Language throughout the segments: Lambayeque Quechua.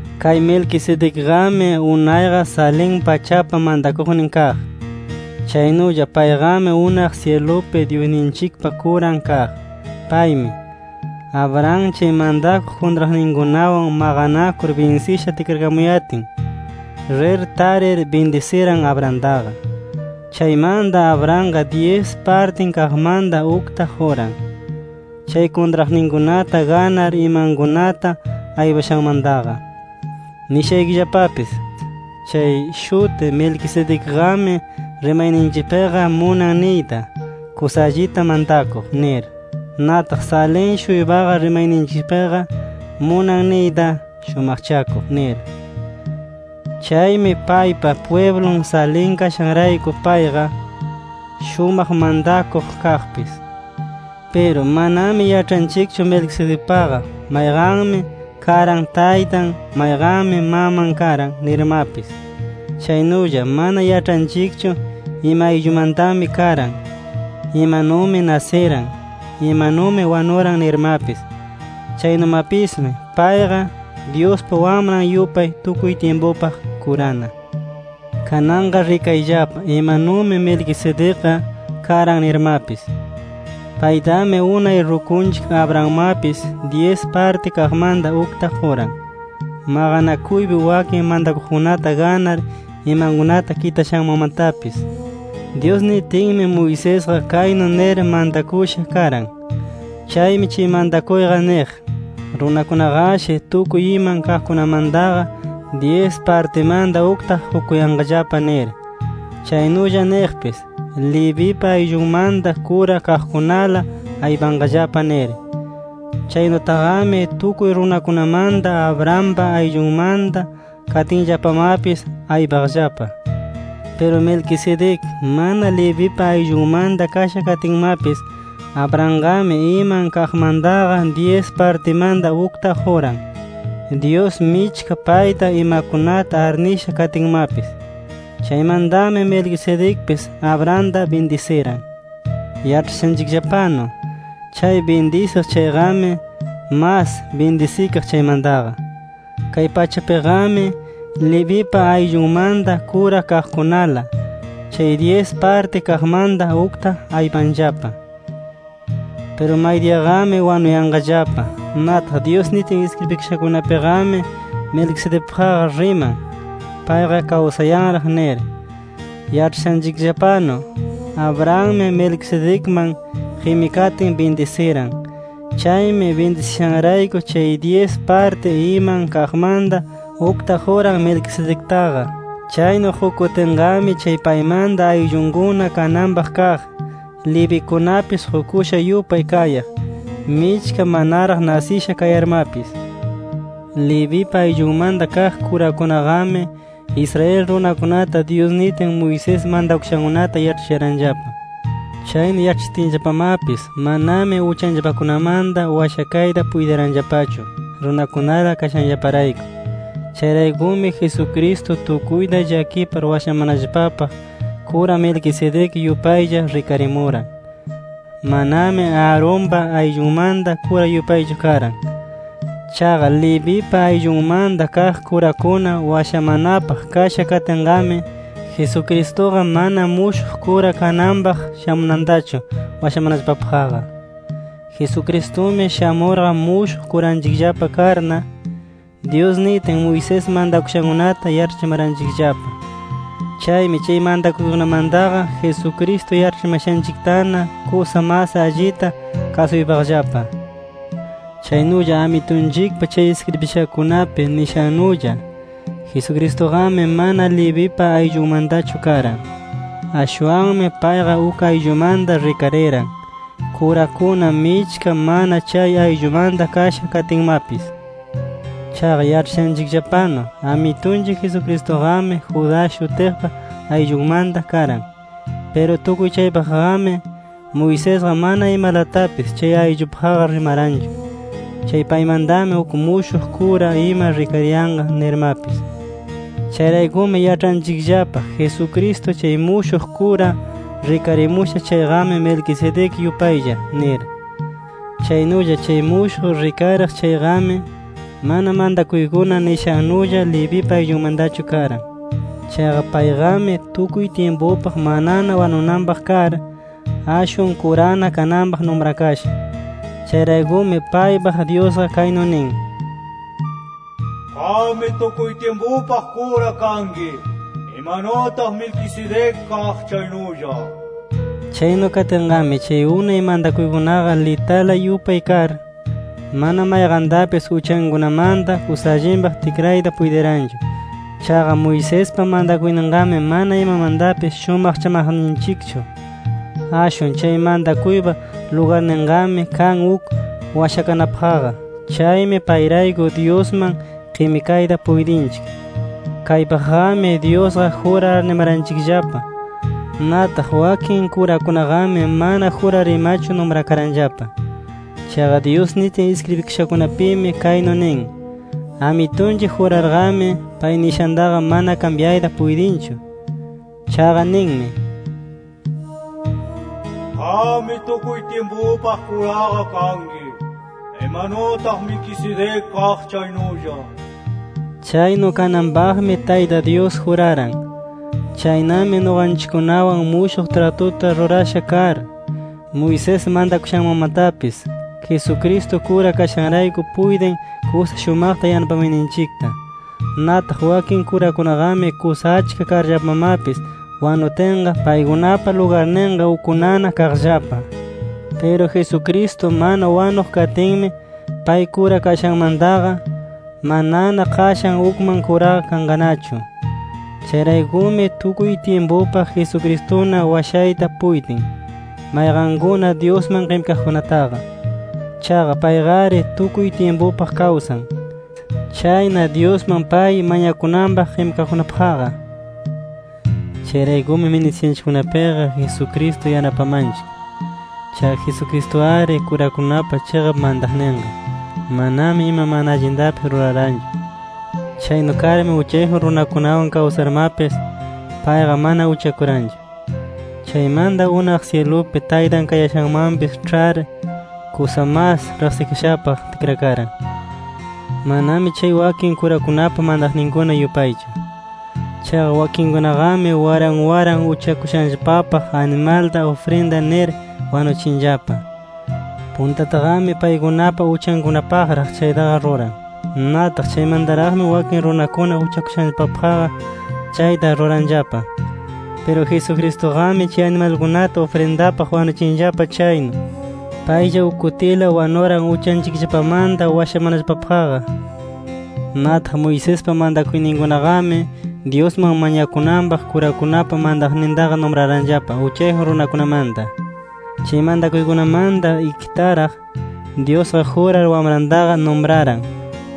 Kay Melquisedecqami, unayqa Salem pachapa mantakuqnin kaq. Chaynulla payqami unaq syilupi Dyusninchikpa kuran kaq. Paymi, Abraham chay mantakuq kuntraqninkunawan maqanakur binsisha tikrakamuyatin, rir tarir bindisiran Abrahamtaqa. Chaymanta Abrahamqa dyis partin kaqmanta ukta quran, chay kuntraqninkunata ganar imankunata aypashanmantaqa. Nishaykillapapis: Chay shuti Melquisedecqami, rimayninchikpiqa munan niyta “Kusa allita mantakuq” nir. Nataq Salem-shuypaqa rimayninchikpiqa munan niyta “Shumaqchakuq” nir. Chaymi paypa pwiblun Salem kashanrayku, payqa “Shumaq mantakuq” kaqpis. Piru manami yaĉhanchikchu Melquisedecpaqa mayqanmi karan taytan, mayqanmi maman karan nirmapis. Chaynulla mana yaĉhanchikchu ima ayllumantami karan, imanumi nasiran, imanumi wanuran nirmapis. Chaynumapismi payqa, Dyuspa Wamran yupay tukuy tyimpupaq kurana. Kananqa rikayllapa imanumi Melquisedecqa karan nirmapis. Paytami unay rukunchik Abrahammapis dyis parti kaqmanta ukta quran, maqanakuypi wakin mantakuqkunata ganar imankunata kitashanmanmatapis. Dyus nitinmi Moisesqa kaynu nir mantakusha karan. Chaymi chay mantakuyqa niq: Runakunaqashi tukuy iman kaqkunamantaqa, dyis partimanta ukta qukuyanqallapa nir. Chaynulla niqpis: Levipa ayllunmanta kura kaqkunala aypanqallapa nir. Chaynutaqami, tukuy runakunamanta Abrahampa ayllunmanta katinllapamapis aypaqllapa. Piru Melquisedec mana Levipa ayllunmanta kasha katinmapis, Abrahamqami iman kaqmantaqa dyis partimanta ukta quran, Dyus michka payta imakunata arnisha katinmapis. Chaymantami Melquisedecpis, Abrahamta bindisiran. Yaĉhashanchikllapanu, chay bindisiq chayqami, mas bindisikaq chaymantaqa. Kay pachapiqami Levipa ayllunmanta kura kaqkunala, chay dyis parti kaqmanta ukta aypanllapa. Piru maydiyaqami wanuyanqallapa. Nataq Dyus nitin iskribikashakunapiqami, Melquisedecpaqqa riman, payqa kawsayanraq nir. Yaĉhashanchikllapanu, Abrahammi Melquisedecman qimikatin bindisiran. Chaymi bindisishanrayku chay dyis parti iman kaqmanta ukta quran Melquisedectaqa. Chaynu qukutinqami chay paymanta ayllunkuna kananpaq kaq Levikunapis qukusha yupay kayaq, michka manaraq nasisha kayarmapis. Levipa ayllunmanta kaq kurakunaqami, Israel runakunata Dyus nitin, Moisés mantakushankunata yaĉhachiranllapa. Chaynu yaĉhachitinllapamapis, manami uchanllapakunamanta washakayta puytiranllapachu runakunala kashanllaparayku. Chayraykumi Jesucristo tukuyta llakipar washamanallapapaq, kura Melquisedec yupaylla rikarimuran. Manami Aaronpa ayllunmanta kura yupaychu karan. Chaqa Levipa ayllunmanta kaq kurakuna washamanapaq kasha katinqami, Jesucristuqa mana mushuq kura kananpaq shamunantachu washamanallapapaqqa. Jesucristumi shamurqa mushuq kuranchikllapa karna, Dyus nitin Moisés mantakushankunata yaĉhachimaranchikllapa. Chaymi chay mantakuykunamantaqa, Jesucristo yaĉhachimashanchiktana kusa mas allita kasuypaqllapa. Chaynulla Amitunchikpa chay iskribishankunapi nishannulla, Jesucristuqami mana Levipa ayllunmantachu karan. Ashwanmi payqa uk ayllumanta rikariran, kurakuna michka mana chay ayllumanta kasha katinmapis. Chaqa yaĉhashanchikllapanu, Amitunchik Jesucristuqami Judá shutiqpa ayllunmanta karan. Piru tukuy chaypaqqami, Moisesqa mana imalatapis chay ayllupaqqa rimaranchu, chay paymantami uk mushuq kura ima rikariyanqa nirmapis. Chayraykumi yaĉhanchikllapa Jesucristo chay mushuq kura rikarimusha chayqami, Melquisedec yupaylla nir. Chaynulla chay mushuq rikariq chayqami, mana mantakuykuna nishannulla Levipa ayllunmantachu karan. Chaqa payqami tukuy tyimpupaq manana wanunanpaq kar, ashwan kurana kananpaq numrakasha. Chayraykumi paypaq Dyusqa kaynu nin: “Qammi tukuy tyimpupaq kura kanki, imanutaq Melquisedec kaq chaynulla” nir. Chaynu katinqami, chay unay mantakuykunaqa litala yupay kar, mana mayqantapis uchankunamanta kusa allinpaq tikrayta puytiranchu. Chaqa Moisespa mantakuyninqami mana imamantapis shumaqchamaqninchikchu. Ashwan chay mantakuypa lugarninqami kan uk washakanapaqqa. Chaymi payrayku Dyusman qimikayta puytinchik. Kaypaqqami, Dyusqa jurar arnimaranchikllapa. Nataq wakin kurakunaqami mana jurar imachu numrakaranllapa. Chaqa Dyus nitin iskribikashakunapimi kaynu nin: “Amitunchik jurarqami, pay nishantaqa mana kambyayta puytinchu. Chaqa ninmi: ‘Qammi tukuy tyimpupaq kuraqa kanki, [imanutaq Melquisedec kaq chaynulla]’ nir”. Chaynu kananpaqmi Tayta Dyus juraran. Chaynami nuqanchikkunawan mushuq tratuta rurasha kar, Moisés mantakushanmanmatapis Jesucristo kura kashanrayku puytin kusa shumaqta yanapamayninchikta. Nataq wakin kurakunaqami kusa achka karllapamapis wanutinqa, paykunapa lugarninqa ukkunana kaqllapa. Piru Jesucristo mana wanuq katinmi, pay kura kashanmantaqa, manana qashan ukman kuraqa kanqanachu. Chayraykumi tukuy tyimpupaq Jesucristuna washayta puytin, mayqankuna Dyusman qimikaqkunataqa. Chaqa payqari tukuy tyimpupaq kawsan. Chayna Dyusman pay mañakunanpaq qimikaqkunapaqqa. Chayraykumi ministiyashanchikkunapiqa Jesucristo yanapamanchik. Chaqa Jesucristu-ari kurakunapa chiqap mantaqninqa. Manami ima mana allintapis ruraranchu. Chaynu karmi uchayjun runakunawan kawsarmapis, payqa mana uchakuranchu. Chaymanta unaq syilupi Taytan kayashanmanpis ĉhar, kusa mas riqsikashapaq tikrakaran. Manami chay wakin kurakunapa mantaqninkuna yupaychu. Chaqa wakinkunaqami waran waran uchakushanllapapaq animalta ufrinda nir wanuchinllapa. Puntataqami paykunapa uchankunapaqraq chaytaqa ruran. Nataq chaymantaraqmi wakin runakuna uchakushanllapapaqqa chayta ruranllapa. Piru Jesucristuqami, chay animalkunata ufrindapaq wanuchinllapa chaynu, paylla uk kutila wanuran uchanchikllapamanta washamanallapapaqqa. Nataq Moisespa mantakuyninkunaqami, Dyusman mañakunanpaq kurakunapa mantaqnintaqa numraranllapa uchayjun runakunamanta. Chay mantakuykunamanta ikitaraq, Dyusqa jurar Wamrantaqa numraran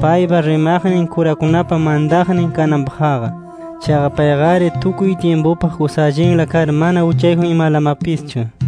paypa rimaqnin kurakunapa mantaqnin kananpaqqa. Chaqa payqari tukuy tyimpupaq kusa allinla kar mana uchayjun imalamapischu.